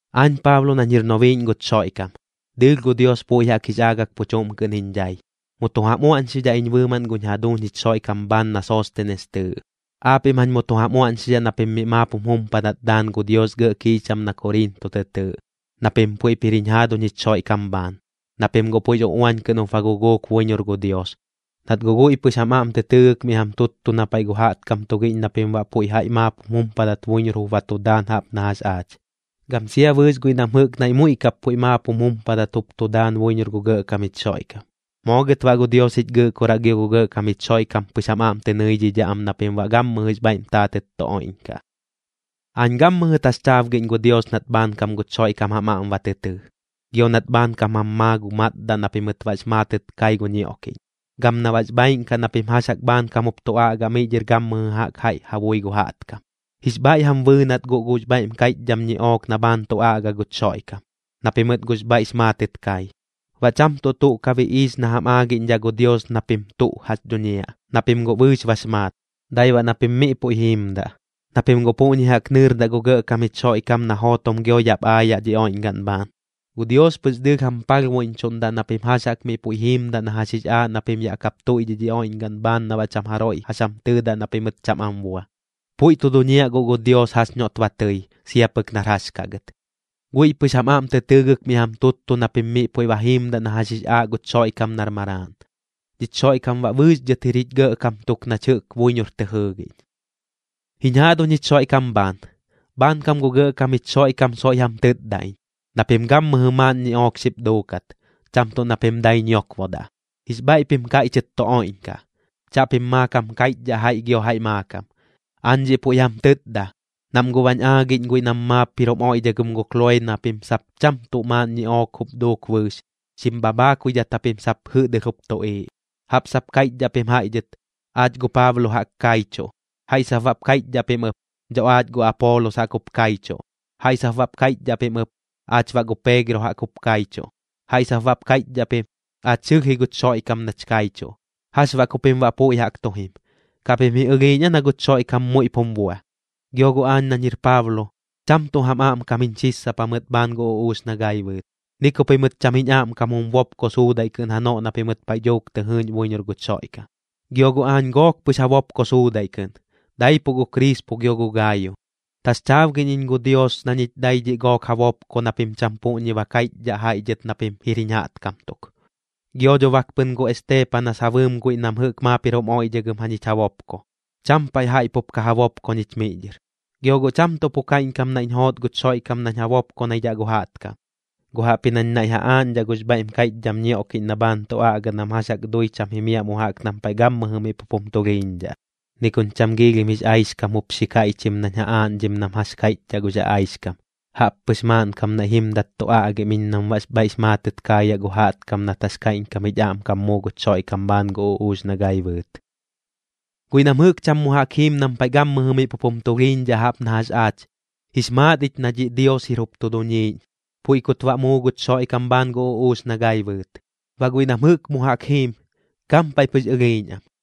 Aañ Paablo nañ jir nobiiꞌñ guch Xoiꞌkam, dɨɨlh gu Dios puiꞌ jaꞌk jix aagak pu chuꞌm kɨꞌn jiñ dhai. Mu tu jam uaꞌñxidhaꞌ iñ bɨɨmaꞌn guñ jaduuñ jich Xoiꞌkam bhaan na Soostenes tɨɨꞌ. Aapiꞌm jañ mu tu jam uaꞌñxidhaꞌ na pim miꞌ maap jum jumpadat daan gu Dios gɇꞌ kiicham na Koriinto tɨ tɨɨꞌ, na pim puiꞌp jir jiñ jaaduñ jich Xoiꞌkam bhaan. Na pim guꞌ puiꞌx uꞌuañ kɨꞌn jup ba guguuk buiñor gu Dios, nat guꞌ guiꞌ pɨx jam aꞌm tɨ tɨɨgɨk miꞌ jam tuttu na paiꞌ gu jaꞌtkam tugiꞌñ na pim baꞌ puiꞌ jaiꞌ maap jum jumpadat buiñor jup ba tu daan jaꞌp na jax aach, gam sia bɨɨx guiꞌ nam jɨꞌk naiꞌ muiꞌ kap puiꞌ maap jum jumpadat jup tu daan buiñor gu Gɇꞌkam jich Xoiꞌkam. Moo gɨt baꞌ gu Dios jich Gɨꞌkoraꞌ gio gu Gɇꞌkam jich Xoiꞌkam pɨx jam aꞌm tɨ nɨidhidhaꞌ am na pim baꞌ gammɨjɨx bhaiꞌm taatɨt tu oiꞌñkaꞌ. Aañ gammɨjɨ taxchaabgiꞌñ gu Dios nat bhaankam guch Xoiꞌkam jam aꞌm ba tɨ tɨɨ, gio nat bhaankam jam maa gu matdaꞌ na pimɨt baꞌx maatɨt kai gu ñioꞌkiꞌñ, gam na baꞌx bhaaiꞌn kaꞌ na pim jax jaꞌk bhaankam jup tu aꞌga miꞌ dhɨr gammɨjɨ jaꞌk jaiꞌ ja bui gu jaꞌtkam. Jix bhaiꞌ jam bɨɨnat guꞌ gux bhaiꞌm kaiꞌchdham ñiꞌook na bhaan tu aꞌga guch Xoiꞌkam, na pimɨt guꞌx bhaiꞌx maatɨt kai. Baꞌ cham tuꞌ tuꞌ ka biꞌiix na jam aagiꞌñdhaꞌ gu Dios na pim tuꞌ jax dhuñiaꞌ, na pim guꞌ bɨɨx bax maat, dai baꞌ na pim miꞌ puiꞌ jiimdaꞌ, na pim guꞌ puꞌñi jaꞌk nɨɨrdaꞌ gu Gɇꞌkam jich Xoiꞌkam na jootom gio yaꞌp aayaꞌ dhi oiꞌñgaꞌn bhaan. Gu Dios pɨx dɨɨlh jam palhbuiꞌñchuꞌndaꞌ na pim jax jaꞌk miꞌ puiꞌ jiimdaꞌ na jax jix aaꞌ na pim yaꞌ kap tuiꞌdhiꞌ dhi oiꞌñgaꞌn bhaan na baꞌ cham jaroiꞌ jax jam tɨɨdaꞌ na pimɨt cham am bua. Puiꞌ tu duñiaꞌ guꞌ gu Dios jax noꞌt ba tɨi sia pɨk nar jax kaꞌ gɨt. Guiꞌ pɨx jam aꞌm tɨ tɨɨgɨk miꞌ jam tuttu na pim miꞌ puiꞌ ba jiimdaꞌ na jax jix aaꞌ guch Xoiꞌkam nar Maraaꞌn. Dhich Xoiꞌkam baꞌ bɨɨx dhɨt jir jich Gɇꞌkam tuk nach jɨꞌk buiñor tɨ jɨɨgiꞌñ. Jiñ jaaduñ jich Xoiꞌkam bhaan, bhaankam gu Gɇꞌkam jich Xoiꞌkam soiꞌ jam tɨtda iñ na pim gammɨjɨ maaꞌn ñiꞌook xip duukat, cham tuꞌ na pim dai ñiokbodaꞌ. Jix bhaiꞌ pim kaiꞌchɨt tu oiꞌñkaꞌ, chaꞌpim maakam kaiꞌchdhaꞌ jaiꞌ gio jaiꞌ maakam. Aañ dhiꞌ puiꞌ jam tɨtda, nam guꞌ bañ aagiꞌñ guiꞌ nam maap jir jum oiꞌdhagɨm gu Kloee na pim sap cham tuꞌ maaꞌn ñiꞌook jup duuk bɨɨx, xim bhabhaakuidhat japim sap jɨꞌdɨlh jup tuꞌiiꞌ. Jaꞌp sap kaiꞌchdhaꞌ pim jaiꞌ dhɨt: “Aach gu Paablo jaꞌk kaichuꞌ.” Jaiꞌ sap baꞌp kaiꞌchdhaꞌ pim ɨp: “Dho aach gu Apoolos jaꞌk jup kaichuꞌ.” Jaiꞌ sap baꞌp kaiꞌchdhaꞌ pim ɨp: “Aach baꞌ gu Peegro jaꞌk jup kaichuꞌ.” Jaiꞌ sap baꞌp kaiꞌchdhaꞌ pim: “Aach sɨlh ji guch Xoiꞌkam nach kaichuꞌ.” ¿Jax baꞌ ku pim baꞌ puiꞌ jaꞌk tu jim? ¿Kaꞌ pim ji ɨlhiiꞌñ aa na guch Xoiꞌkam muiꞌp jum bua? Gio guꞌ aañ nañ jir Paablo, cham tuꞌ jam aꞌmkam jiñ xissapa mɨt bhaan gu uꞌuux na gai bɨɨt, ni ku pimɨt cham jiñ aꞌmkam jum bopko suudaiꞌ kɨꞌn janoꞌ na pimɨt paiꞌ dhuuk tɨ jɨɨꞌñ buiñor guch Xoiꞌkam. Gio guꞌ aañ gook pɨx ja bopko suudaiꞌ kɨꞌn, daipuꞌ gu Krispo gio gu Gaayo. Taxchaabgiꞌñ iñ gu Dios na ñich dai dhiꞌ gook ja bopko na pim cham puꞌñi ba kaiꞌchdhaꞌ jaiꞌ dhɨt na pim jir jiñ jaꞌtkam tuk. Gio dho bak pɨn gu Esteepanas ja bɨɨm guiꞌ nam jɨꞌk maap jir jum oiꞌdhagɨm jañich ja bopko. Cham paiꞌ jaiꞌ pup ka ja bopko ñich miꞌ dhɨr. Gio guꞌ cham tuꞌ pu kaiꞌñkam naiꞌñ joot guch Xoiꞌkam nañ ja bopkonaidhaꞌ gu jaꞌtkam, guꞌ jaꞌpji nañ naiꞌ ja aaꞌñdhaꞌ gux bhaiꞌm kaiꞌchdham ñioꞌkiꞌñ na bhaan tu aꞌga nam jax jaꞌk dui cham jimiaꞌ mu jaꞌk nam paiꞌ gammɨjɨ miꞌ pup jum tulhiiñdhaꞌ. Ni kuñ cham giilhim jix aixkam jup xi kaiꞌchim nañ ja aaꞌñdhim nam jax kaiꞌchdhaꞌ gux aꞌaixkam, jaꞌppɨx maaꞌnkam naiꞌ jimdat tu aꞌgim iñ nam baꞌx bhaiꞌx maatɨt kaayaꞌ gu jaꞌtkam nat jax kaiꞌñkam jich aꞌmkam muu guch Xoiꞌkam bhaan gu uꞌuux na gai bɨɨt. Guiꞌ nam jɨꞌk cham mu jaꞌk jiim nam paiꞌ gammɨjɨ miꞌ pup jum tulhiiñdhaꞌ jaꞌp na jax aach, jix maat ich na dhiꞌ Dios jup jir tu duniiꞌñ, puiꞌ kut baꞌ muu guch Xoiꞌkam bhaan gu uꞌuux na gai bɨɨt. Baꞌ guiꞌ nam jɨꞌk mu jaꞌk jiim, gampaiꞌ pɨx ɨlhiiꞌñ am.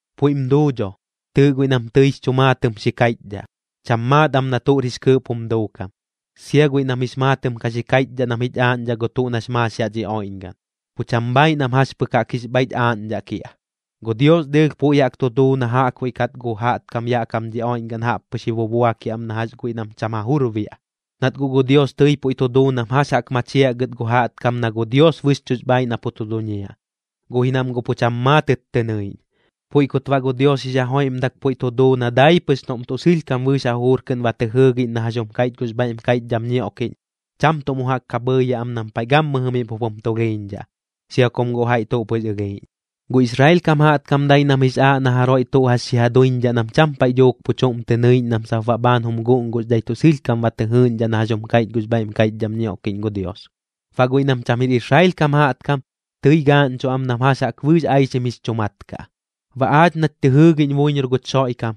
Puiꞌm duu dho. Tɨɨꞌ guiꞌ nam tɨix chu maatɨm xi kaiꞌchdhaꞌ, cham maat am na tuꞌr jix kɨɨꞌp jum duukam. Sia guiꞌ nam jix maatɨm ka xi kaiꞌchdhaꞌ nam jich aaꞌñdhaꞌ gu tuꞌ nax maax yaꞌ dhi oiꞌñgaꞌn, pu cham bhaaiꞌ nam jax pɨk jaꞌk jix bhaiꞌch aaꞌñdhaꞌ kiaꞌ. Gu Dios dɨɨlh puiꞌ jaꞌk tu duu na jaꞌkbuiꞌ kat gu jaꞌtkam yaꞌ kam dhi oiꞌñgaꞌn jaꞌppɨx ji bubuakiaꞌ am na jax guiꞌ nam cham ja jur biaꞌ. Nat guꞌ gu Dios tɨi puiꞌ tu duu nam jax jaꞌk machiaꞌ gɨt gu jaꞌtkam na gu Dios bɨxchuꞌx bhaaiꞌ na pu tu duñiaꞌ, guꞌ ji nam guꞌ pu cham maatɨt tɨ nɨiꞌñ. Puiꞌ kut baꞌ gu Dios jix ja joiꞌmdak puiꞌ tu duu na dai pɨx noꞌm tuꞌ sɨlhkam bɨɨx ja jujur kɨꞌn ba tɨ jɨɨgiꞌñ na jax jum kaiꞌch gux bhaiꞌm kaiꞌchdham ñioꞌkiꞌñ, cham tuꞌ mu jaꞌk ka bhɨɨyaꞌ am nam paiꞌ gammɨ miꞌ pup jum tulhiiñdhaꞌ, sia kum guꞌ jaiꞌ tuꞌ pɨx ɨlhiiꞌñ. Gu Israel kam jaꞌtkam dai nam jix aaꞌ na jaroiꞌ tuꞌ jax xi ja duiñdhaꞌ nam cham paiꞌ dhuuk pu chuꞌm tɨ nɨiꞌñ nam sap baꞌ bhaan jum guꞌnguxdhai tuꞌ sɨlhkam ba tɨ jɨɨꞌñdhaꞌ na jax jum kaiꞌch gux bhaiꞌm kaiꞌchdham ñioꞌkiꞌñ gu Dios. Baꞌ guiꞌ nam cham jir Israel kam jaꞌtkam, tɨi gaaꞌñchuꞌ am nam jax jaꞌk bɨɨx aixim jix chu mat kaꞌ. Baꞌ aach nach tɨ jɨɨgiꞌñ buiñor guch Xoiꞌkam,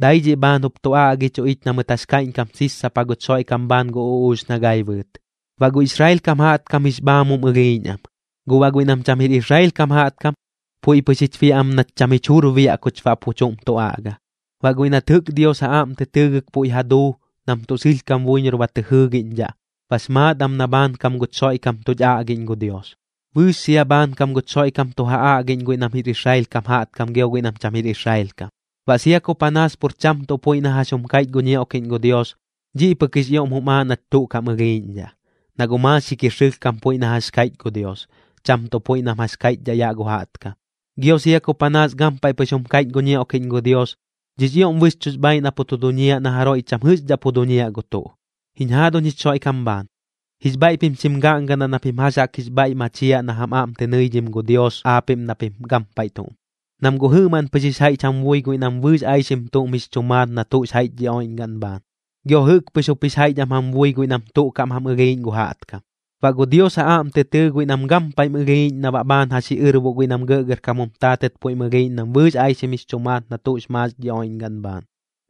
dai dhiꞌ bhaan jup tu aꞌgichuꞌ ich na mɨt jax kaiꞌñkam sissapa guch Xoiꞌkam bhaan gu uꞌuux na gai bɨɨt. Baꞌ gu Israel kam jaꞌtkam jix bhaamum ɨlhiiꞌñ am, guꞌ baꞌ guiꞌ nam cham jir Israel kam jaꞌtkam, puiꞌ pɨx jich biaꞌ am nach cham jich jur biaꞌ kuch baꞌ pu chuꞌm tu aꞌga. Baꞌ guiꞌ nat jɨꞌk Dios ja aꞌm tɨ tɨɨgɨk puiꞌ ja duu nam tuꞌ sɨlhkam buiñor ba tɨ jɨɨgiꞌñdhaꞌ, bax maat am na bhaankam guch Xoiꞌkam tuch aꞌgiꞌñ gu Dios. Bɨɨx sia bhaankam guch Xoiꞌkam tu ja aꞌgiꞌñ guiꞌ nam jir Israel kam jaꞌtkam gio guiꞌ nam cham jir Israel kam. Baꞌ sia ku panaas pur cham tuꞌ puiꞌ na jax jum kaiꞌch gu ñioꞌkiꞌñ gu Dios, dhiꞌ pɨk jix ioꞌm jum aaꞌ nach tuꞌ kaꞌm ɨlhiiꞌñdhaꞌ, na guꞌ maaxik jir sɨlhkam puiꞌ na jax kaiꞌch gu Dios, cham tuꞌ puiꞌ nam jax kaiꞌchdhaꞌ yaꞌ gu jaꞌtkam. Gio sia ku panaas gampaiꞌ pɨx jum kaiꞌch gu ñioꞌkiꞌñ gu Dios, dhiꞌx ioꞌm bɨxchuꞌx bhaaiꞌ na pu tu duñiaꞌ na jaroiꞌ cham jɨꞌxdhaꞌ pu duñiaꞌ gu tuꞌ. Jiñ jaaduñ jich Xoiꞌkam bhaan, jix bhaiꞌ pim xim gaꞌngadaꞌ na pim jax jaꞌk jix bhaiꞌ machiaꞌ na jam aꞌm tɨ nɨidhim gu Dios aapiꞌm na pim gampaiꞌ tuꞌm. Nam guꞌ jɨꞌmaꞌn pɨx jix jaiꞌch jam bui guiꞌ nam bɨɨx aixim tuꞌm jix chu maat na tuꞌx jaiꞌch dhi oiꞌñgaꞌn bhaan. Gio jɨꞌk pɨx jup jix jaiꞌch am jam bui guiꞌ nam tuꞌ kaꞌm ja ɨlhiiꞌñ gu jaꞌtkam. Baꞌ gu Dios ja aꞌm tɨ tɨɨ guiꞌ nam gampaiꞌm ɨlhiiꞌñ na baꞌ bhaan ja xiꞌɨrboꞌ guiꞌ nam gɇꞌgɇrkam jum taatɨt puiꞌm ɨlhiiꞌñ nam bɨɨx aixim jix chu maat na tuꞌx maax dhi oiꞌñgaꞌn bhaan.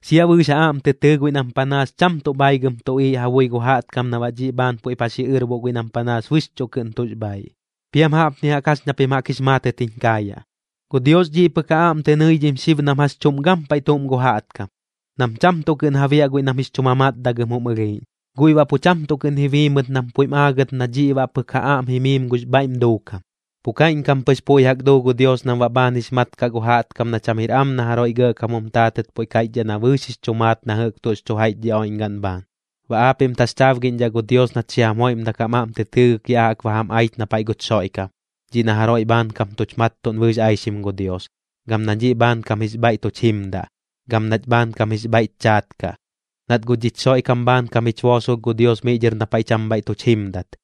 Sia bɨɨx ja aꞌm tɨ tɨɨ guiꞌ nam panaas cham tuꞌ bhaigɨm tuꞌiiꞌ ja bui gu jaꞌtkam na baꞌ dhiꞌ bhaan puiꞌp ja xiꞌɨrboꞌ guiꞌ nam panaas bɨxchuꞌ kɨꞌn tuꞌx bhaaiꞌ. Piam jaꞌpni jaꞌk jax ña pim jaꞌk jix maatɨt jiñ kaayaꞌ: Gu Dios dhiꞌ pɨk ja aꞌm tɨ nɨidhim xib nam jax chuꞌm gampaiꞌ tuꞌm gu jaꞌtkam, nam cham tuꞌ kɨꞌn ja biaꞌ guiꞌ nam jix chu mamatdagɨm jum ɨlhiiꞌñ. Guiꞌ baꞌ pu cham tuꞌ kɨꞌn ji bii mɨt nam puiꞌm aagɨt na dhiꞌ baꞌ pɨk ja aꞌm jimiim gux bhaiꞌm duukam. Pu kaiꞌñkam pɨx puiꞌ jaꞌk duu gu Dios nam baꞌ bhaan jix mat kaꞌ gu jaꞌtkam na cham jir am na jaroiꞌ gɇꞌkam jum taatɨt puiꞌ kaiꞌchdhaꞌ na bɨɨx jix chu maat na jɨꞌk tuꞌx chu jaiꞌch dhi oiꞌñgaꞌn bhaan. Baꞌ aapiꞌm taxchaabgiꞌñdhaꞌ gu Dios nat xi jam joiꞌmdak jam aꞌm tɨ tɨɨgɨk ya jaꞌk ba jam aich na paiꞌ guch Xoiꞌkam, dhiꞌ na jaroiꞌ bhaankam tuch mattuꞌn bɨɨx aixim gu Dios, gam na dhiꞌ bhaankam jix bhaiꞌ tuch jimdaꞌ, gam nach bhaankam jix bhaiꞌch chaat kaꞌ. Nat guꞌ dhich Xoiꞌkam bhaankam jich boosolh gu Dios miꞌ dhɨr na paiꞌ cham bhaiꞌ tuch jimdat.